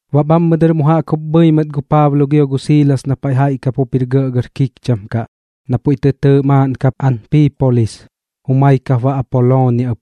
Baꞌ bhammɨ dɨr mu jaꞌk pu bhɨi mɨt gu Paablo gio gu Siilas na paiꞌ jaiꞌ kap jup jir gɇꞌgɇr kikcham kaꞌ, na puiꞌ tɨ tɨɨꞌ maaꞌn kap Anpiipolis, gu jumai kap baꞌ Apoloonia ɨp.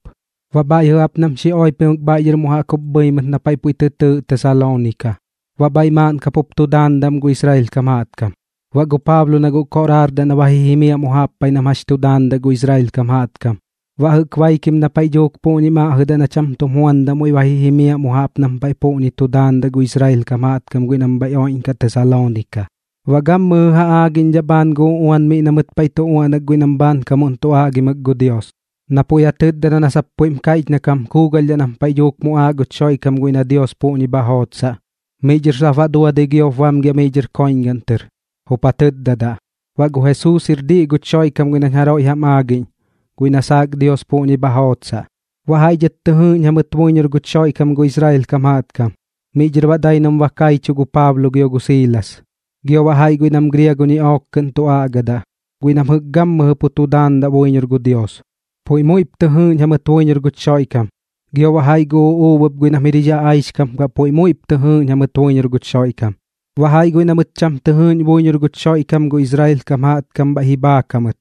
Baꞌ bhaiꞌ jɨꞌ jaꞌp nam xi oipimɨk bhaiꞌ dhɨr mu jaꞌk jup bhɨi mɨt na paiꞌ puiꞌ tɨ tɨɨꞌ Tesaloonika, baꞌ bhaiꞌ maaꞌn kap jup tu daandaꞌ am gu Israel kam jaꞌtkam. Baꞌ gu Paablo na guꞌ koꞌraardaꞌ na ba ji jimiaꞌ mu jaꞌp paiꞌ nam jax tu daandaꞌ gu Israel kam jaꞌtkam, baꞌ jɨꞌk baikim na paiꞌ dhuuk puꞌñim aꞌjɨdaꞌ na cham tum juandaꞌ muiꞌ ba ji jimiaꞌ mu jaꞌp nam paiꞌ puꞌñi tu daandaꞌ gu Israel kam jaꞌtkam guiꞌ nam bhaiꞌ oiꞌñkaꞌ Tesaloonika, baꞌ gammɨjɨ ja aagiꞌñdhaꞌ bhaan gu uꞌuan miꞌ na mɨt paiꞌ tu uaꞌnak guiꞌ nam bhaankamuꞌn tu aꞌgimɨk gu Dios, na puiꞌ ja tɨtdadaꞌ na sap puiꞌm kaiꞌch na kam kuugalhdhaꞌ nam paiꞌ dhuuk muꞌaaꞌ guch Xoiꞌkam guiꞌ na Dios puꞌñi bha jootsaꞌ. Miꞌ dhɨr sap baꞌ duadɨi giop bamgiaꞌ miꞌ dhɨr koiꞌñgaꞌn tɨr, jup ja tɨtdadaꞌ: ―Baꞌ gu Jesuus jir diꞌ guch Xoiꞌkam guiꞌ nañ jaroiꞌ jam aagiꞌñ, guiꞌ na saak Dios puꞌñi bha jootsaꞌ. Baꞌ jaiꞌ dhɨt tɨ jɨɨꞌñ jamɨt buiñor guch Xoiꞌkam gu Israel kam jaꞌtkam, miꞌ dhɨr baꞌ dai nam ba kaichuꞌ gu Paablo gio gu Siilas. Gio baꞌ jaiꞌ guiꞌ nam griago ñiꞌook kɨꞌn tu aꞌgadaꞌ, guiꞌ nam jɨꞌk pu gammɨjɨ tu daandaꞌ buiñor gu Dios, puiꞌ muiꞌp tɨ jɨɨꞌñ jamɨt buiñor guch Xoiꞌkam, gio baꞌ jaiꞌ gu uꞌuub ɨp guiꞌ nam jir jix aꞌaixkam kaꞌ puiꞌ muiꞌp tɨ jɨɨꞌñ jamɨt buiñor guch Xoiꞌkam. Baꞌ jaiꞌ guiꞌ na mɨt cham tɨ jɨɨꞌñ buiñor guch Xoiꞌkam gu Israel kam jaꞌtkam bhaiꞌ ji bhaak jamɨt,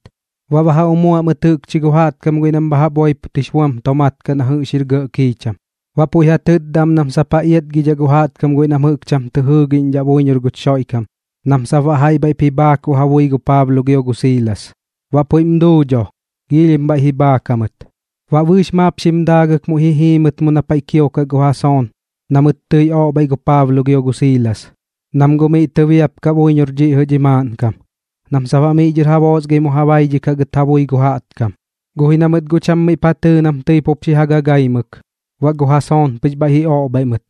baꞌ ba ja umuaꞌ mɨt jɨꞌkchi gu jaꞌtkam guiꞌ nam bha jaꞌp oipot jix buam tomaat kaꞌ na jɨꞌx jir gɇꞌ kiicham, baꞌ puiꞌ ja tɨtda am nam sap ja iatgidhaꞌ gu jaꞌtkam guiꞌ nam jɨꞌk cham tɨ jɨɨgiꞌñdhaꞌ buiñor guch Xoiꞌkam nam sap baꞌ jaiꞌ bhaiꞌp ji bhaakuꞌ ja bui gu Paablo gio gu Siilas. Baꞌ puiꞌm duu dho, giilhim bhaiꞌ ji bhaak jamɨt. Baꞌ bɨɨx maap xim daagɨk muiꞌ tɨi jii mɨt mu na paiꞌ kiokaꞌ gu Jason na mɨt tɨi oꞌbhaiꞌ gu Paablo gio gu Siilas, nam guꞌ miꞌ tɨbiapkaꞌ buiñor dhiꞌ jɨꞌ dhi maaꞌnkam, nam sap baꞌ miꞌ dhɨr ja boosgai mu ja baidhikaꞌ gɨt ja bui gu jaꞌtkam. Guꞌ ji na mɨt guꞌ cham miꞌp ja tɨɨ nam tɨi pup xi ja gaagaimɨk, baꞌ gu Jason pɨx bhaiꞌ ji oꞌbhaiꞌ mɨt.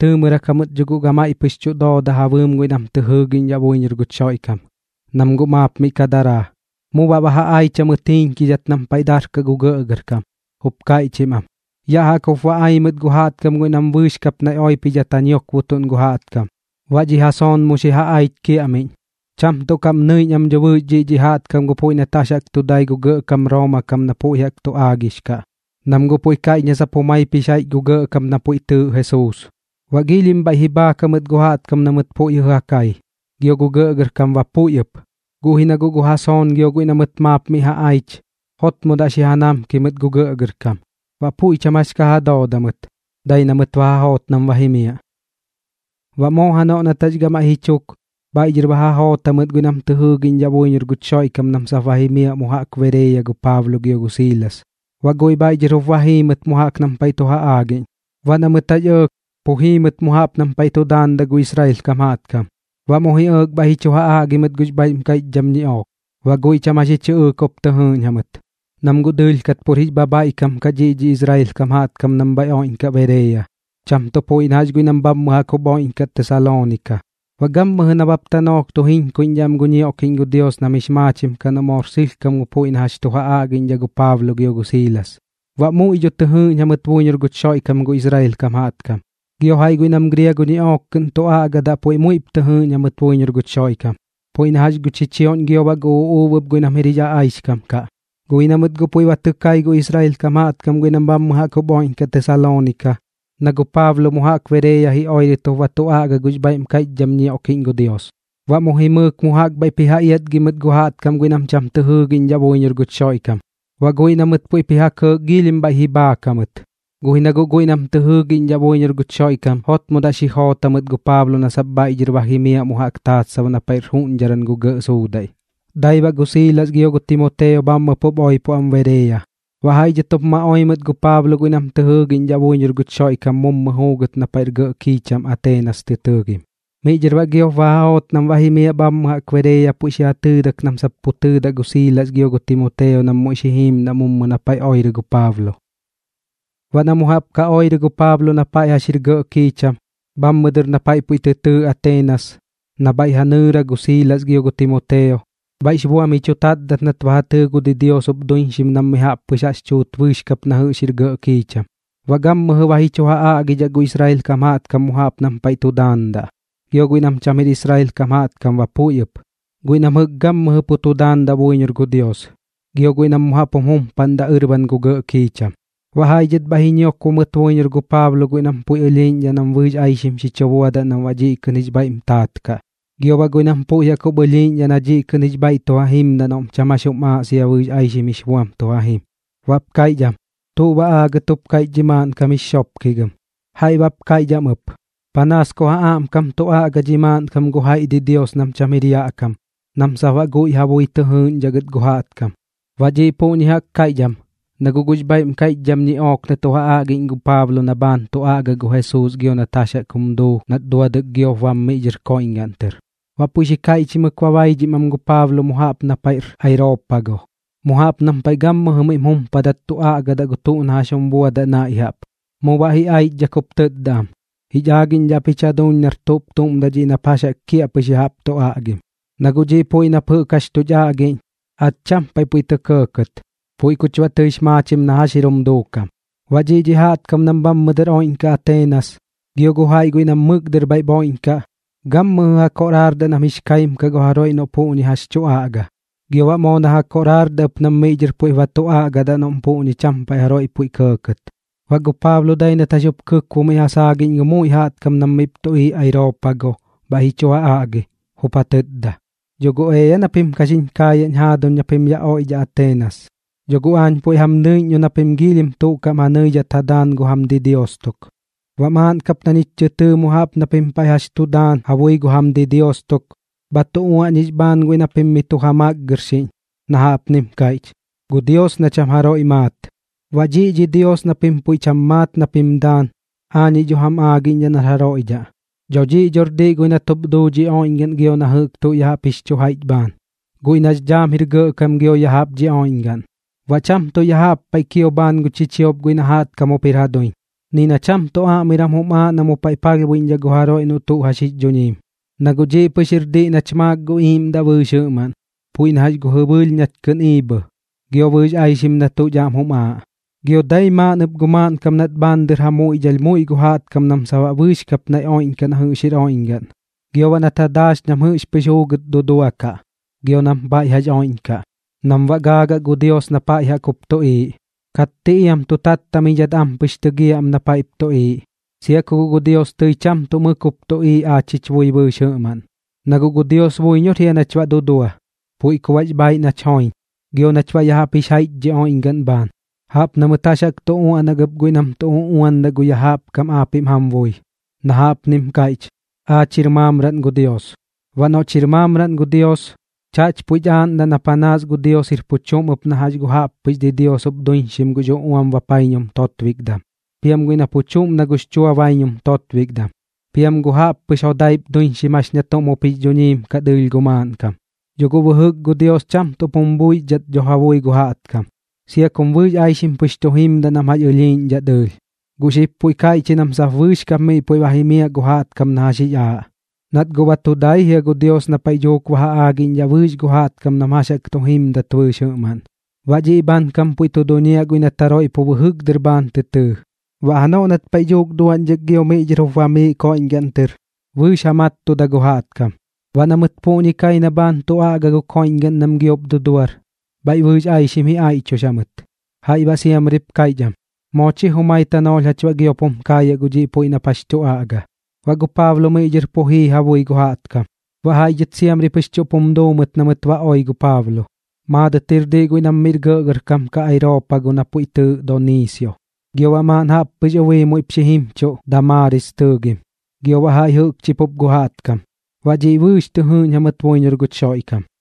Tɨɨmɨrak jamɨt dho guꞌ gamaiꞌ pɨx tu dooda ja bɨɨm guiꞌ nam tɨ jɨɨgiꞌñdhaꞌ buiñor guch Xoiꞌkam, nam guꞌ maap miꞌ ka daraa. Mu baꞌ ba ja aich jamɨt jiiñkidhat nam paiꞌ darkaꞌ gu gɇꞌgɇrkam jup kaiꞌchim am: ―Yaꞌ jaꞌk jup ba ai mɨt gu jaꞌtkam guiꞌ nam bɨɨx kap naiꞌ oipidhat ja ñiokbotuꞌn gu jaꞌtkam, baꞌ dhi Jason mu xi ja aich kiaꞌmiꞌñ. Cham tuꞌ kaꞌm nɨiꞌñ am dho bɨɨx dhiꞌ dhi jaꞌtkam gu puiꞌ nat jax jaꞌk tu dai gu gɇꞌkam Rooma kam na puiꞌ jaꞌk tu aagix kaꞌ, nam guꞌ puiꞌ kaiꞌch na sap jumaip jix jaiꞌch gu gɇꞌkam na puiꞌ tɨɨꞌ Jesuus. Baꞌ giilhim bhaiꞌ ji bhaak jamɨt gu jaꞌtkam na mɨt puiꞌ jɨꞌ ja kai, gio gu gɇꞌgɇrkam ba puiꞌ ɨp. Guꞌ ji na guꞌ gu Jason gio guiꞌ na mɨt maap mi ja aich, jotmodaꞌ xi ja namki mɨt gu gɇꞌgɇrkam. Baꞌ puiꞌ cham jax ka ja dooda mɨt, dai na mɨt ba ja joot nam ba jimiaꞌ. Baꞌ moo janoꞌ nat jax gamaiꞌ ji chuk, bhaiꞌ dhɨr ba ja joot jamɨt guiꞌ nam tɨ jɨɨgiꞌñdhaꞌ buiñor guch Xoiꞌkam nam sap ba jimiaꞌ mu jaꞌk Bereeya gu Paablo gio gu Siilas, baꞌ guiꞌ bhaiꞌ dhɨr jup ma jii mɨt mu jaꞌk nam paiꞌ tu ja aagiꞌñ. Baꞌ na mɨt jax ɇɇk, pu jii mɨt mu jaꞌp nam paiꞌ tu daandaꞌ gu Israel kam jaꞌtkam. Baꞌ mu ji ɇɇk bhaiꞌ ji chu ja aꞌgi mɨt gux bhaiꞌm kaiꞌchdham ñiꞌook. Baꞌ guiꞌ cham jax ji chɨꞌɨɨk jup tɨ jɨɨꞌñ jamɨt, nam guꞌ dɨɨlh kat pur jix bhabhaiꞌkam kaꞌ dhiꞌ jɨꞌ dhi Israel kam jaꞌtkam nam bhaiꞌ oiꞌñkaꞌ Bereeya, cham tuꞌ puiꞌ na jax guiꞌ nam bhammɨ jaꞌk jup oiꞌñkaꞌ Tesaloonika. Baꞌ gammɨjɨ nabap tanoolh tu jiñkuiꞌñdhaꞌ am gu ñioꞌkiꞌñ gu Dios nam jix maachim kaꞌ noꞌ moor sɨlhkam gu puiꞌ na jax tu ja aꞌgiꞌñdhaꞌ gu Paablo gio gu Siilas. Baꞌ muiꞌ dho tɨ jɨɨꞌñ jamɨt buiñor guch Xoiꞌkam gu Israel kam jaꞌtkam, gio jaiꞌ guiꞌ nam griago ñiꞌook kɨꞌn tu aꞌgadaꞌ puiꞌ muiꞌp tɨ jɨɨꞌñ jamɨt buiñor guch Xoiꞌkam, puiꞌ na jax gu chichioꞌñ gio baꞌ gu uꞌuub ɨp guiꞌ nam jir jix aꞌaixkam kaꞌ. Guꞌ ji na mɨt guꞌ puiꞌ ba tɨ kai gu Israel kam jaꞌtkam guiꞌ nam bhammɨ jaꞌk jup oiꞌñkaꞌ Tesaloonika na gu Paablo mu jaꞌk Bereeya ji oirɨt jup ba tu aꞌga gux bhaiꞌm kaiꞌchdham ñioꞌkiꞌñ gu Dios. Baꞌ mu jimɨɨk mu jaꞌk bhaiꞌp ji ja iatgi mɨt gu jaꞌtkam guiꞌ nam jɨꞌk cham tɨ jɨɨgiꞌñdhaꞌ buiñor guch Xoiꞌkam, baꞌ guiꞌ na mɨt puiꞌp ji ja kɇɇk giilhim bhaiꞌ ji bhaak jamɨt. Guꞌ ji na guꞌ guiꞌ nam tɨ jɨɨgiꞌñdhaꞌ buiñor guch Xoiꞌkam jotmodaꞌ xi joot jamɨt gu Paablo na sap bhaiꞌ dhɨr ba jimiaꞌ mu jaꞌk taatsab na paiꞌr juꞌñdharan gu gɇꞌ suudaiꞌ. Dai baꞌ gu Siilas gio Timoteo bhammɨ pup oipo am Bereeya. Baꞌ jaiꞌ dhɨt jup ma oi mɨt gu Paablo guiꞌ nam tɨ jɨɨgiꞌñdhaꞌ buiñor guch Xoiꞌkam mummɨ juugɨt na paiꞌr gɇꞌ kiicham kaꞌ Ateenas tɨ tɨɨgim. Miꞌ dhɨr baꞌ giop ba ja joot nam ba jimiaꞌ bhammɨ jaꞌk Bereeya puiꞌ xi ja tɨɨdak nam sap pu tɨɨdaꞌ gu Siilas gio gu Timoteo nam muiꞌ xi jiimdaꞌ mummɨ na paiꞌ oirɨ gu Paablo. Baꞌ na mu jaꞌp ka oirɨ gu Paablo na paiꞌ jax jir gɇꞌ kiicham, bhammɨ dɨr na paiꞌ puiꞌ tɨ tɨɨꞌ Ateenas, na bhaiꞌ ja nɨɨra gu Siilas gio gu Timoteo, bhaiꞌx buam ji chu tatdat nat ba ja tɨɨ gu didios jup duiñxim nam mi jaꞌp pɨx jaꞌx tuut bɨɨx kap na jɨꞌx jir gɇꞌ kiicham. Baꞌ gammɨjɨ ba ji chu ja aꞌgidhaꞌ gu Israel kam jaꞌtkam mu jaꞌp nam paiꞌ tu daandaꞌ, gio guiꞌ nam cham jir Israel kam jaꞌtkam ba puiꞌ ɨp, guiꞌ nam jɨꞌk gammɨjɨ pu tu daandaꞌ buiñor gu Dios, gio guiꞌ nam mu jaꞌp jum jumpaꞌndaꞌ ɨrban gu gɇꞌ kiicham. Baꞌ jaiꞌ dhɨt bhaiꞌ ji ñiokbo mɨt buiñor gu Paablo guiꞌ nam puiꞌ ɨlhiiꞌñdhaꞌ nam bɨɨx aixim xi chu buadaꞌ nam baꞌ dhiꞌ kɨꞌn jix bhaiꞌm taat kaꞌ, gio baꞌ guiꞌ nam puiꞌ jaꞌk jup ɨlhiiꞌñdhaꞌ na dhiꞌ kɨꞌn jix bhaiꞌ tu ja jimdaꞌ noꞌm cham jax jum aaꞌ sia ku bɨɨx aixim jix buam tu ja jim. Baꞌp kaiꞌch am: ―¿Tuꞌ baꞌ aagat jup kaiꞌch dhi maaꞌnkam jix xopkigɨm? Jaiꞌ baꞌp kaiꞌch am ɨp: ―Panaas ku ja aꞌmkam tu aꞌga dhi maaꞌnkam gu jaiꞌ didios nam cham jir yaꞌ kam, nam sap baꞌ guiꞌ ja bui tɨ jɨɨꞌñdhaꞌ gɨt gu jaꞌtkam. Baꞌ dhiꞌ puꞌñi jaꞌk kaiꞌch am, na guꞌ gux bhaiꞌm kaiꞌchdham ñiꞌook na tu ja aꞌgiꞌñ gu Paablo na bhaan tu aꞌga gu Jesuus gio nat jax jaꞌk jum duu nat duadɨk giop bam miꞌ dhɨr koiꞌñgaꞌn tɨr. Baꞌ puiꞌ xi kaiꞌchimɨk ba baidhim am gu Paablo mu jaꞌp na paiꞌr Areopago, mu jaꞌp nam paiꞌ gammɨjɨ miꞌm jumpaꞌndat tu aꞌgadaꞌ gu tuꞌ na jax jum buadaꞌ naiꞌ jaꞌp. Mu baꞌ ji aichdhak jup tɨtda am: ―Jich aagiꞌñdhaꞌ ap jich jaduuñ nar tuꞌp tuꞌm daꞌ dhiꞌ nap jax jaꞌk kiaꞌpɨx ya jaꞌp tu aꞌgim. Na guꞌ dhiꞌ puiꞌ nap jɨꞌk jax tuch aꞌgiꞌñ, aach cham paiꞌ puiꞌ tɇ kɇɇkɇt, puiꞌ kuch baꞌ tɨix maachim na jax jir jum duukam. Baꞌ dhiꞌ dhi jaꞌtkam nam bhammɨ dɨr oiꞌñkaꞌ Ateenas, gio gu jaiꞌ guiꞌ nam mɨk dɨr bhaiꞌp oiꞌñkaꞌ, gammɨjɨ ja koꞌraardaꞌ nam jix kaim kaꞌ gu jaroiꞌ noꞌ puꞌñi jax tu aꞌga, gio baꞌ moo na ja koꞌraardaꞌ ɨp nam miꞌ dhɨr puiꞌp ba tu aꞌgadaꞌ noꞌm puꞌñi cham paiꞌ jaroiꞌ puiꞌ kɇɇkɇt. Baꞌ gu Paablo dai nat jax jup kɨkbo miꞌ ja saagiꞌñ gu muiꞌ jaꞌtkam nam miꞌp tuꞌiiꞌ Areopago bhaiꞌ ji chu ja aꞌgi, jup ja tɨtda: ―Dho guꞌ ea na pim ka xiñ kaayaꞌñ jaaduñ na pim yaꞌ oiꞌdhaꞌ Ateenas. Dho guꞌ aañ puiꞌ jam nɨiꞌñ dho na pim giilhim tuꞌ kaꞌm ja nɨidhat ja daan gu jam didios tuk. Baꞌ maaꞌn kap na ñich tɨ tɨɨ mu jaꞌp na pim paiꞌ jax chu daan ja bui gu jam didios tuk, bha tu uaꞌñix bhaan guiꞌ na pim miꞌ tu ja makgɨrxiꞌñ, na jaꞌpnim kaiꞌch, “Gu Dios na cham jaroiꞌ maat.” Baꞌ dhiꞌ dhi Dios na pim puiꞌ cham maat na pim daan, aañiꞌ dho jam aagiꞌñdhaꞌ nar jaroiꞌ dhaꞌ. ’Dho dhiꞌ dhor diꞌ guiꞌ nat jup duu dhi oiꞌñgaꞌn gio na jɨꞌk tuꞌ ya jaꞌp jix chu jaiꞌch bhaan, guiꞌ nax dhaam jir gɇꞌkam gio ya jaꞌp dhi oiꞌñgaꞌn, baꞌ cham tuꞌ ya jaꞌp paiꞌ kio bhaan gu chichiop guiꞌ na jaꞌtkam jup jir ja duiñ. Ni na cham tuꞌ aꞌmiram jum aaꞌ na mu paiꞌ palhbuiꞌñdhaꞌ gu jaroiꞌ gu tuꞌ noꞌ jax jix dhuñiim, na guꞌ dhiꞌ pɨx jir diꞌ nach maak gu iiꞌmdaꞌ bɨɨx jɨꞌmaꞌn, puiꞌ na jax gu jɨbɨɨlh nach kɨꞌn iibhɨ, gio bɨɨx aixim na tuꞌch aꞌm jum aaꞌ. ’Gio dai maaꞌn ɨp gu maaꞌnkam nat bhaan dɨr ja muiꞌdhalh muiꞌ gu jaꞌtkam nam sap baꞌ bɨɨx kap naiꞌ oiꞌñkaꞌ na jɨꞌx jir oiꞌñgaꞌn, gio baꞌ nat ja daax nam jɨꞌx pɨx juugɨt duduakaꞌ gio nam paiꞌ jax oiꞌñkaꞌ, nam baꞌ ba gaagaꞌ gu Dios na pa jaꞌk jup tuꞌiiꞌ, katti iam tu tattamidhat am pɨx tɨgiaꞌ am na paiꞌp tuꞌiiꞌ, sia ku guꞌ gu Dios tɨi cham tuꞌ mɨk jup tuꞌiiꞌ aach jich bui bɨɨx jɨꞌmaꞌn. Na guꞌ gu Dios buiñor jia nach baꞌ dudua, puiꞌ ku baꞌx bhaaiꞌ nach joiñ, gio nach baꞌ ya jaꞌp jix jaiꞌch dhi oiꞌñgaꞌn bhaan, jaꞌp na mɨt jax jaꞌk tu uaꞌnak ɨp guiꞌ nam tu uꞌuandaꞌ gu yaꞌ kam aapiꞌm jam bui, na jaꞌpnim kaiꞌch: “Aach jir maamraꞌn gu Dios.” Baꞌ noꞌch jir maamraꞌn gu Dios, chaꞌch puich aaꞌndaꞌ na panaas gu Dios jir pu chuꞌm na jax gu jaꞌppɨx didios jup duiñxim gux uꞌuam bapaiñum totbikdam, piam guiꞌ na pu chuꞌm na gux chua baiñum totbikdam, piam gu jaꞌppɨx jodaip duiñxim jax ña tuꞌm jup jix dhuñiim kaꞌ dɨɨlh gu maaꞌnkam. Dho guꞌ bɨjɨk gu Dios cham tuꞌp jum buixdhat dho ja bui gu jaꞌtkam, sia kum bɨɨx aixim pɨx tu jimdaꞌ nam jax ɨlhiiꞌñdhaꞌ dɨɨlh, guꞌ xib puiꞌ kaiꞌch ji nam sap bɨɨx kap miꞌ puiꞌ ba jimiaꞌ gu jaꞌtkam na jax jix aaꞌ. Nat guꞌ ba tu dai jia gu Dios na paiꞌ dhuuk ba ja aagiꞌñdhaꞌ bɨɨx gu jaꞌtkam nam jax jaꞌk tu jimdat bɨɨx jɨꞌmaꞌn. Baꞌ dhiꞌ bhaankam puiꞌ tu duñiaꞌ guiꞌ nat jaroiꞌ pu bɨjɨk dɨr bhaan tɨ tɨɨ, baꞌ janoꞌ nat paiꞌ dhuuk duaꞌñdhak gio miꞌ dhɨr jup bamiiꞌ koiꞌñgaꞌn tɨr, bɨɨx ja mattuda gu jaꞌtkam. Baꞌ na mɨt puꞌñi kai na bhaan tu aꞌga gu koiꞌñgaꞌn nam giop duduar, bhaiꞌ bɨɨx aixim ji aiꞌchux jamɨt. Jaiꞌ baꞌ siamrip kaiꞌch am: ―Moo chi jumai tanoolh jach baꞌ giop jum kaayaꞌ gu dhiꞌ puiꞌ nap jax tu aꞌga. Baꞌ gu Paablo miꞌ dhɨr pu jii ja bui gu jaꞌtkam. Baꞌ jaiꞌ dhɨt siamri pɨx chuꞌp jum duu mɨt na mɨt ba oi gu Paablo. Maadɨt jir diꞌ guiꞌ nam miꞌr gɇꞌgɇrkam kaꞌ Areopago na puiꞌ tɨɨꞌ Doniisio, gio baꞌ maaꞌn jaꞌppɨx ubii muiꞌp xi jimchuꞌ Damaaris tɨɨgim, gio baꞌ jaiꞌ jɨꞌkchi pup gu jaꞌtkam. Baꞌ dhiꞌ bɨɨx tɨ jɨɨꞌñ jamɨt buiñor guch Xoiꞌkam.